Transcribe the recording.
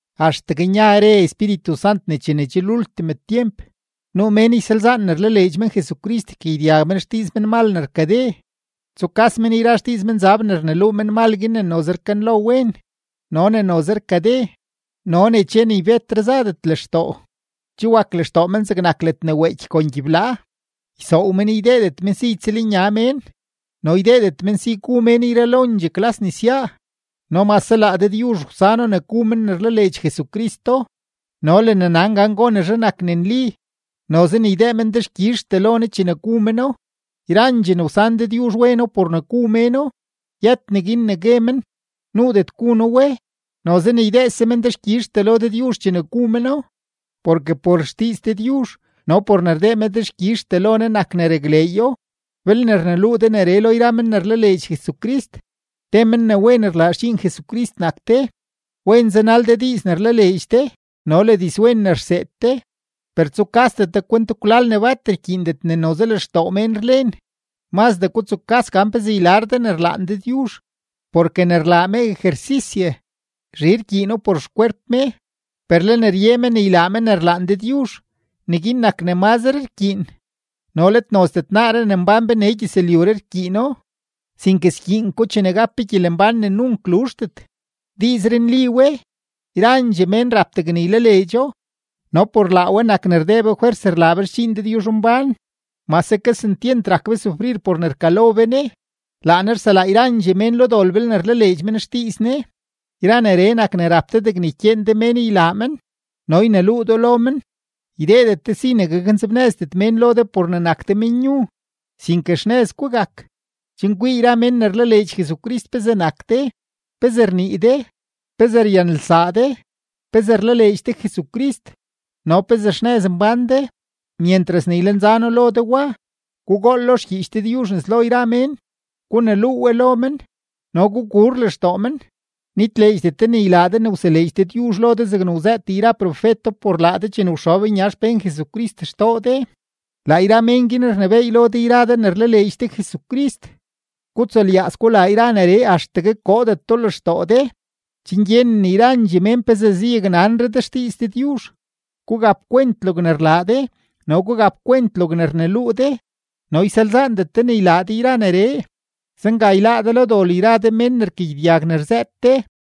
Axtegue nya re Espíritu Sant ne chene lultim tyemp, nuu mén ysalzaan ne rlaleedx men Jesucrist, ykagyedyag men xdiiz menmal ne rkade, tsukas men yra xdiiz menzab ne rneluu menmal guin ne noze rkanlo wen, no ne noze rkade, no ne che ni betre zadet lextoo; che wak lextoo men zegnak ledne weeky kon gyiblaa. Ysoow men ydeedet men si ytsëlnya mén, no ydeedet men si gu mén yralondxee klas nesyaa no mase laa Dëdyuzh wsano ne gu men ne rlaleedx Jesucristo no le ne nan gan gonezhe nak ne nli, noze ne ydee men dexkyizhtee lo Ne chene gu meno. Yrandxee ne wsan Dëdyuzh weno por ne gu méno. Yët neguin ne gue men: “Nuudet gu noo we”, noze ne ydeese men dexkyizhtee lo Dëdyuzh chene gu meno, porke por xdiiz Dëdyuzh no por ne rdee me dexkyizhtee lo Ne nak ne rakleeyo. Belne rneluu de neree lo yra men ne rlaleedx Jesucrist, te men ne wen rlaa xdxiin Jesucrist nak de, wen zanal de diiz ne rlaleedx de no le dizwen ne rseed de. Per tsukasdet de kwent kwlal ne bat rkyiindet ne noze lextoo mén rlen; mazdee gutsukas gan pezee ylar de ne rlaan Dëdyuzh. Porke ne rlaa me ejersisye, zhi rkyiino por xkwerp me, per le ne rye me ne ylaa me ne rlaan Dëdyuzh, neguin nak ne mazre rkyiin no let nozdet naaree ne mbán be nee gyëzlyuree rkyiino, sinke skyiin ko chene gap be gyelembán ne nunk luzhdet. Diizree nli we; yrandxee mén rap degne ylaleedxo. No por laa we nak ne rdee be fwers rlaa be xdxiin Dëdyuzhmbán, mase kesentyent rak be sufrir por ne rkalo be Ne; laa Ne rselaa yrandxee mén lo dol belne rlaleedx men xdiiz Ne. Yra neree nak ne rap de degne ykyeen de mén ylaa men no yneluu do lo men. Ydeedet de si ne gaknzebnëzdet mén lo de por ne nak de menyu, sinke xnëz gugak, chen kwii yra mén ne rlaleedx Jesucrist pezee nak de, pezee rnii de, pezee ryanelsaa de, pezee rlaleedx de Jesucrist, no pezee xnëz mbán de. Myentras ne ylenza noo lo de wa, gugool lo xgyiich Dëdyuzh nes lo yra mén, guneluu we lo men, no gugur lextoo men. Nitleedxdet de ne ylaa de ne wseleedx Dëdyuzh lo de zegne wzëët yra profeto por laa de chene wxob nya xpén Jesucrist xtoo de. Laa yra mén guin rnebééy lo de yra de ne rlaleedx de Jesucrist. Gutsulyaaz gulaa yra neree axtegue koodet do lextoo de, chen gyenen yrandxee mén pezee zayaknanre de xdiiz Dëdyuzh. Gugapkwent logne rlaa de no gugapkwent logne rneluu de no ysalzaandet de ne ylaa de yra neree. Zenga yláá de lo dol yra de mén ne rkagyedyag ne rzëët de.